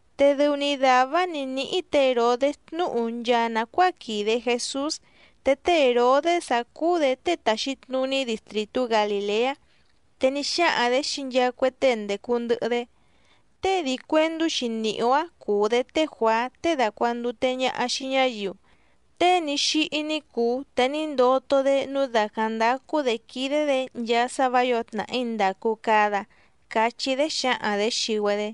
Te dɨu‑ni dàvá‑áⁿ nǐ níhí tě Hèrodés tnúhu nchaa nàcuáa quìde Jesús, te té Hèrodés‑áⁿ cúú‑dě tée tàxi tnuní distrìtú Galìleá. Te ní xáhaⁿ‑dě xii nchaa cue tée ndècu ndɨhɨ‑dé: —Tée dii cuèndú‑xi nìhí‑ó‑áⁿ cùu‑dé té Juàá tée dàcuandute ñaha xii ñáyiu, tée ní xíhí ní cùu te ní ndoto‑dé nǔu dàcáⁿ ndácú‑dě quídé‑dě nchaa sá vǎ yǒo tnàhí ndàcu cada —cachí‑dé xǎhaⁿ‑dě xii‑güedé.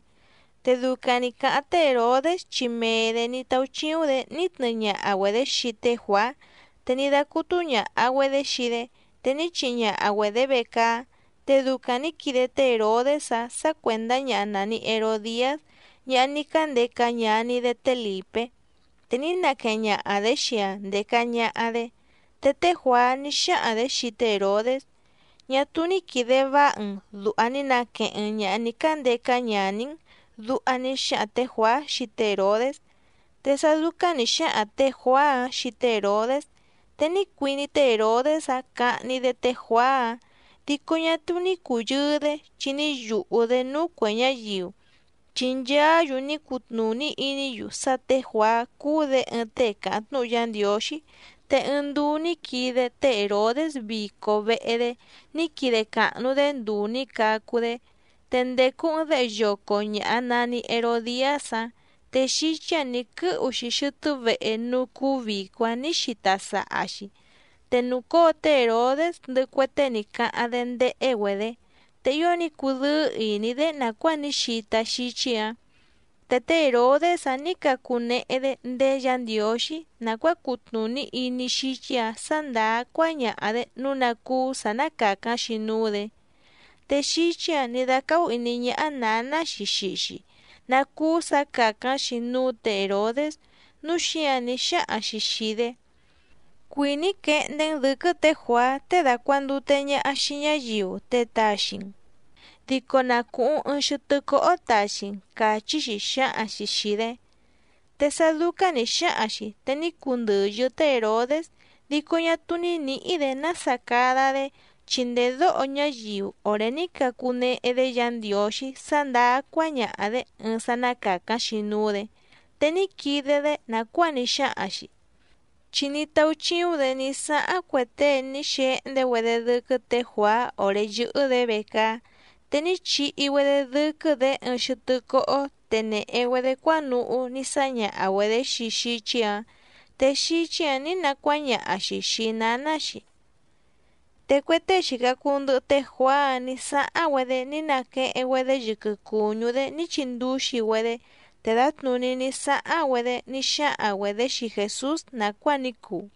Te ducaⁿ nǐ cáháⁿ té Hèrodés chi mee‑dě ní táúchíúⁿ‑dě ní tnɨɨ ñaha‑güedě xii té Juàá, te ní dácútú ñàha‑güedé xii‑dé, te ní chihi ñaha‑güedě vecaá. Te ducaⁿ nǐ quide té Hèrodés‑áⁿ sǎ cuèndá ñaha nàni Herodiás, ñaha ní cándeca ñaní‑dé té Lìpé, te ní naqueheⁿ ñaha‑dě xii‑aⁿ ndèca ñaha‑dé. Te té Juàá ní xáhaⁿ‑dě xii té Hèrodés: —Ñá túú ní quìde váha‑n dùha ní naqueheⁿ‑n ñàha ní cándeca ñaní‑n —duha ní xáhaⁿ tě Juàá xii té Hèrodés. Te sá dúcáⁿ nǐ xáhaⁿ tě Juàá‑áⁿ xii té Hèrodés, te ní cuiní té Hèrodés‑áⁿ cahni‑dé té Juàá‑áⁿ, dico ñá túú ní cùyɨɨ‑dé chi ní yùhú‑dé núú cuè ñáyiu, chi nchaá‑yu ní cutnùní iní‑yu sá tě Juàá cúú‑dě ɨɨⁿ tée càháⁿ tnúhu Yá Ndiǒxí. Te ɨɨⁿ nduu ní quide té Hèrodés vico vehe‑dé ní quide càhnu‑dé nduu nǐ cacu‑dé. Te ndècu ɨɨⁿ déhe yoco ñàha nani Herodiás‑áⁿ, te xíchí‑ǎⁿ nǐ quɨ́hu‑xi xɨtɨ́ vehe núú cúú vìco‑áⁿ nǐ xita saha‑xi. Te nùcóo té Hèrodés ndɨhɨ cue tée ní cáháⁿ‑dé ndéhé‑güedě, te ío ní cudɨ́ɨ́ ìní‑dé nàcuáa ní xita xíchí‑ǎⁿ. Te té Hèrodés‑áⁿ nǐ cacunehe‑dé ndéé Yǎ Ndiǒxí nàcuáa cutnùní iní xíchí‑ǎⁿ sǎ ndàá cuáñaha‑dě nǔu ná cúú sǎ ná càcáⁿ‑xi núú‑dě. Te xíchí‑ǎⁿ nǐ dácáhú ìní ñáhá nǎná‑xi xii‑xi ná cúú sǎ càcáⁿ‑xi núú tě Hèrodés, núu xíǎⁿ ní xáhaⁿ‑xi xìi‑dé: —Cuìní‑í quehndé‑n dɨ̌quɨ́ tě Juàá tée dàcuandute ñaha xii ñáyiu te taxi‑n, dico na cùhuⁿ ɨɨⁿ xɨtɨ́ cóhó taxi‑n —càchí‑xi xǎhaⁿ‑xi xìi‑dé. Te sá dúcáⁿ nǐ xáhaⁿ‑xi, te ní cundɨ̀yɨ́ té Hèrodés, dico ñá túú ní nǐhí‑dě nása cada‑dé, chi ndèdóho ñáyiu òré ní cacunehe‑dé Yǎ Ndiǒxí sá ndàá cuáñaha‑dě ɨɨⁿ sá ná càcáⁿ‑xi núú‑dě. Te ní quide‑dé nàcuáa ní xáhaⁿ‑xi. Chi ní táúchíúⁿ‑dě ní sáháⁿ cue tée ní xehndé‑güedé dɨ́quɨ́ tě Juàá òré yɨ́hɨ́‑dě vecaá. Te ní chihi‑güedé dɨ́quɨ́‑dě ɨɨⁿ xɨtɨ́ cóhó te nèhe‑güedé cuánuhú ní sáñaha‑güedě xii xíchí‑ǎⁿ, te xíchí‑ǎⁿ nǐ nacuáñaha‑xi xìi náná‑xi. Te cue tée xìca cuu ndɨhɨ té Juàá‑áⁿ nǐ sáháⁿ‑güedé ní naqueheⁿ‑güedé yɨquɨ cùñú‑dé ní chindúxi‑güedé, te dǎtnùní ní sáháⁿ‑güedé ní xáhaⁿ‑güedě xii Jèsús nàcuáa ní cuu.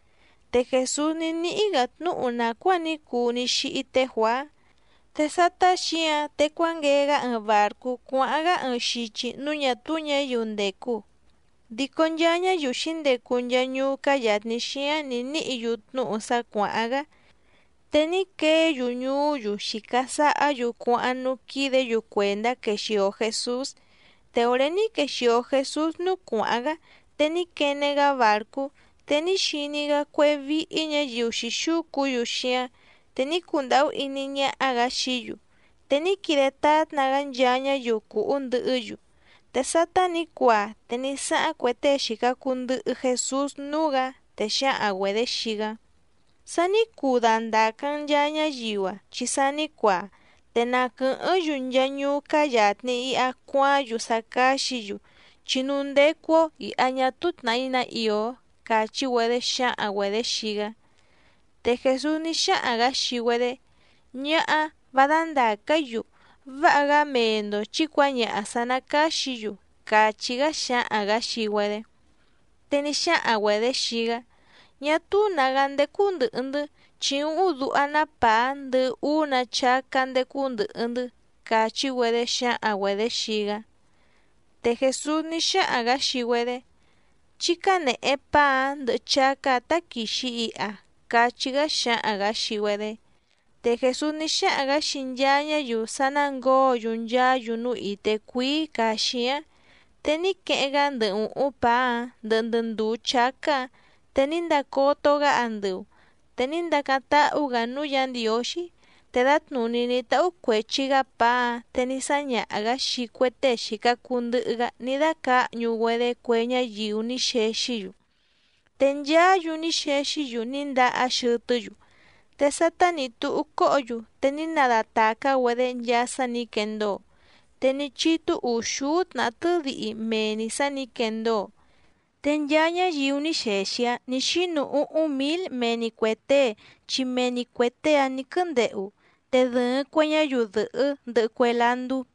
Te Jèsús ní níhí‑gǎ tnúhu nàcuáa ní cuu ní xíhí té Juàá. Te sátá xǐǎⁿ te cuánguee‑gá ɨɨⁿ bàrcú cuáháⁿ‑gá ɨɨⁿ xichi núú ñà túú ñǎyiu ndècu, dico nchaa ñáyiu xǐndecu nchaa ñuú cáá yàtni xíáⁿ nǐ níhǐ‑yu tnúhu sá cuàháⁿ‑gá, te ní queé‑yu ñuú‑yu xìca sahá‑yu cuáháⁿ núú quídě‑yu cuèndá quexìo Jesús. Te òré ní quexìo Jesús núú cuàháⁿ‑gá, te ní quene‑gá bàrcú, te ní xiní‑gá cuéhé víhí ñǎyiu xǐxúcu‑yu xíáⁿ, te ní cundàhú iní ñáhá‑gǎ xií‑yu, te ní quide tátna‑gá nchaa ñáyiu cùhú ndɨhɨ́‑yu. Te sátá nǐ cuaa te ní sáháⁿ cue tée xìca cuu ndɨhɨ Jesús núú‑gǎ, te xǎhaⁿ‑güedě xii‑gá: —Sa ní cuu dandàca‑n nchaa ñáyiu‑a chi sa ní cuaa, te na quɨ̀hɨ́ⁿ‑yu nchaa ñuú cáá yàtni iha cuaáⁿ‑yu sá cáxǐ‑yu, chi núú ndécú‑ó ìha ñá túú tnàhí ná ìó —càchí‑güedé xǎhaⁿ‑güedě xii‑gá. Te Jèsús ní xáhaⁿ‑gǎ xii‑güedé: —Ñáhá, vá dándàca‑í‑yu, váha‑gá mee‑ndo chǐ cuǎñaha sǎ ná càxí‑yu —càchí‑gá xǎhaⁿ‑gǎ xii‑güedé. Te ní xáhaⁿ‑güedě xii‑gá: —Ñá túú nǎgá ndécú ndɨ̀hɨ‑ndɨ́, chi úhúⁿ duha‑ná pàá ndɨhɨ úú‑nǎ chácá ndécú ndɨ̀hɨ‑ndɨ́ —càchi‑güedé xǎhaⁿ‑güedě xii‑gá. Te Jèsús ní xáhaⁿ‑gǎ xii‑güedé: —Chí cánèhe paá‑áⁿ ndɨhɨ chácá‑ǎⁿ táquìxi iha —cachí‑gá xǎhaⁿ‑gǎ xii‑güedé. Te Jèsús ní xáhaⁿ‑gǎ xii nchaa ñáyiu sá ná ngǒo‑yu nchaá‑yu núú ìté cuíí càa xíáⁿ, te ní queheⁿ‑gá ndɨ ùhúⁿ pàá‑áⁿ ndɨhɨ ndɨ ndùú chácá‑ǎⁿ te ní ndacoto‑gá andɨu, te ní ndacáⁿ táhú‑gǎ núú Yǎ Ndiǒxí, te dǎtnùní ní táhú cuèchi‑gá pàá‑áⁿ te ní sáñaha‑gǎ xii cue tée xìca cuu ndɨhɨ‑gá ní dácǎhñu‑güedé cue ñáyiu ní xexí‑yu. Te nchaá‑yu ní xexí‑yu ní ndahá xɨtɨ́‑yu. Te sátá nǐ túhú cóhǒ‑yu te ní nadatàcá‑güedé nchaa sá nǐ quendóo, te ní chítú ùxúú tnàhá tɨ́dihi mee‑ni sǎ nǐ quendóo. Te nchaa ñáyiu ní xexi‑áⁿ nǐ xínu úhúⁿ mǐl mee‑ni cuè tée chi mee‑ni cuè tée‑áⁿ nǐ quɨ́úndehu, te dɨ̀ɨⁿ cue ñáyiu dɨ̀hɨ́ ndɨhɨ cue landú.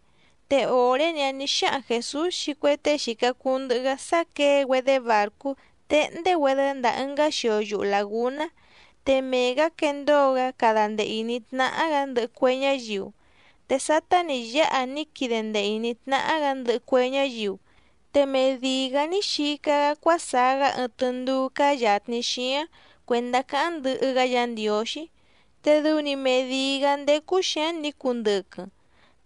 Te òré‑ni‑áⁿ nǐ xáhaⁿ Jèsús xii cue tée xìca cuu ndɨhɨ‑gá sá quěe‑güedé bàrcú téhndé‑güedé ndàa ɨngá xio yuhu làgúná, te mee‑gǎ quendóo‑gá cada ndee ìní tnáhá‑gǎ ndɨhɨ cue ñáyiu. Te sátá nǐ yáha ní quide ndee ìní tnáhá‑gǎ ndɨhɨ cue ñáyiu, te medìi‑gá ní xica‑gá cuásaá‑gá ɨɨⁿ tɨndúú cáá yàtni xíáⁿ cuèndá cáháⁿ ndɨhɨ‑gá Yǎ Ndiǒxí, te dɨu‑ni medìi‑gá ndécú xǐáⁿ nǐ cundɨquɨⁿ.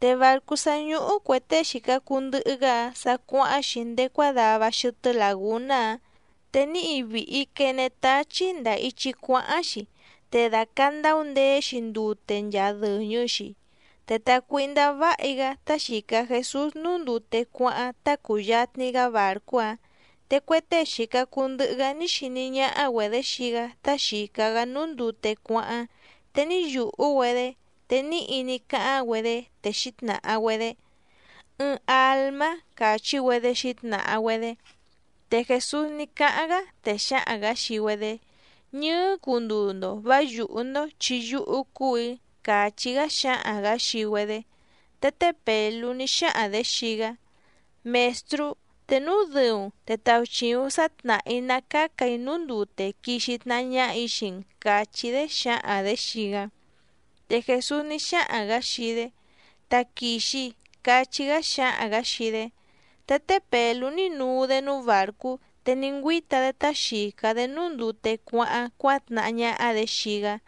Te bàrcú sá ñúhú cuè tée xìca cuu ndɨhɨ‑gá‑áⁿ sa cuáháⁿ‑xi ndéé cuádava xɨtɨ́ làgúná‑áⁿ, te níhi vìhi quene táchí ndàa ichi cuáháⁿ‑xi, te dàcandau ndeé‑xi ndute nchaa dɨ̀ñɨ‑xi. Te tàcuíhndá váhi‑gá tá xìca Jesús núú ndute cuáháⁿ tá cùyatni‑gá bàrcú‑áⁿ. Te cue tée xìca cuu ndɨhɨ‑gá ní xiní ñáhá‑güedě xii‑gá tá xìca‑gá núú ndute cuáháⁿ, te ní yùhú‑güedé te níhi ní cáháⁿ‑güedé te xǐtnàha‑güedé: —¡Ɨɨⁿ àlmá! —càchí‑güedé xǐtnàha‑güedé. Te Jèsús ní cáháⁿ‑gá, te xǎhaⁿ‑gǎ xii‑güedé: —Ñɨɨ́ cunduu‑ndo vǎ yùhú‑ndó, chi yúhú cúù‑í —càchí‑gá xǎhaⁿ‑gǎ xii‑güedé. Te té Pèlú ní xáhaⁿ‑dě xii‑gá: —Mèstrú, te núu dɨu‑n te tauchìuⁿ sá tnàhá‑í ná càca‑í núú ndute quixi tnahá ñáhà‑í xii‑n —càchí‑dé xǎhaⁿ‑dě xii‑gá. Te Jèsús ní xáhaⁿ‑gǎ xii‑dé: —Taquìxi —cachí‑gá xǎhaⁿ‑gǎ xii‑dé. Te té Pèlú ní nuu‑dé núú bàrcú, te ní ngüíta‑dé tá xìca‑dé núú ndute cuáháⁿ cuátnahá ñáhá‑dě xii‑gá.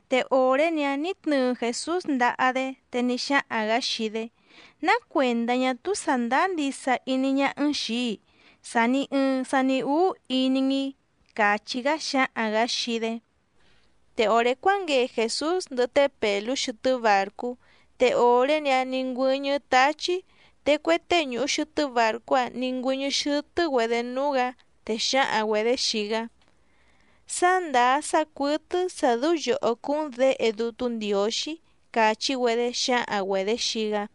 Te òré‑ni‑áⁿ nǐ tnɨɨ Jèsús ndaha‑dé, te ní xáhaⁿ‑gǎ xii‑dé: —¿Ná cuèndá ñá túú sàndáá ndisa iní ñáhá‑n xìi‑í sàni ɨɨⁿ sani úú iní‑n‑i? —càchí‑gá xǎhaⁿ‑gǎ xii‑dé. Te òré cuánguee Jèsús ndɨhɨ té Pèlú xɨtɨ́ bàrcú, te òré‑ni‑áⁿ nǐ ngüɨ́ñɨ́ táchí. Te cue tée ñùhu xɨtɨ́ bàrcú‑áⁿ nǐ ngüɨ́ñɨ́ xɨ́tɨ́‑güedě núú‑gǎ, te xǎhaⁿ‑güedě xii‑gá: —Sá ndàá sá cuɨ́tɨ́ sǎ dɨ́ú yòhó cúú‑n Děhe Dútú Ndiǒxí —càchí‑güedé xǎhaⁿ‑güedě xii‑gá.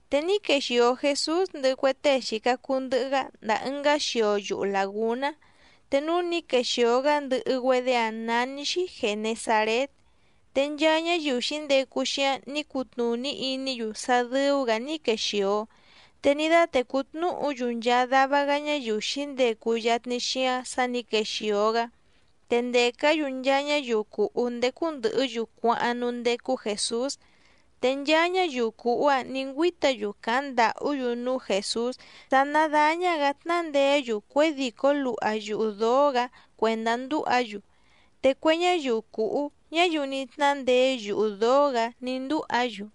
Te ní quexìo Jesús ndɨhɨ cue tée xìca cuu ndɨhɨ‑gá ndàa ɨngá xio yuhu làgúná, te núú nǐ quexìo‑gá ndɨhɨ‑güedé‑áⁿ nání‑xí Gènesarét. Te nchaa ñáyiu xǐndecu xíáⁿ nǐ cutnùní iní‑yu sá dɨ́ú‑gǎ ní quexìo, te ní dátècú tnúhu‑yu nchaa dava‑gá ñáyiu xǐndecu yatni xíáⁿ sǎ nǐ quexìo‑gá. Te ndècá‑yu nchaa ñáyiu cùhú ndécú ndɨ̀hɨ́‑yu cuáháⁿ núú ndécú Jèsús. Te nchaa ñáyiu cùhú‑áⁿ nǐ ngüíta‑yu càháⁿ ndàhú‑yu núú Jèsús sá ná dàña‑gá tnándeé‑yu cuědìcó luha yuhu dǒó‑gǎ cuèndá ndúha‑yu, te cue ñáyiu cùhú, ñáyiu ní tnándeé yuhu dǒó‑gǎ ní ndúha‑yu.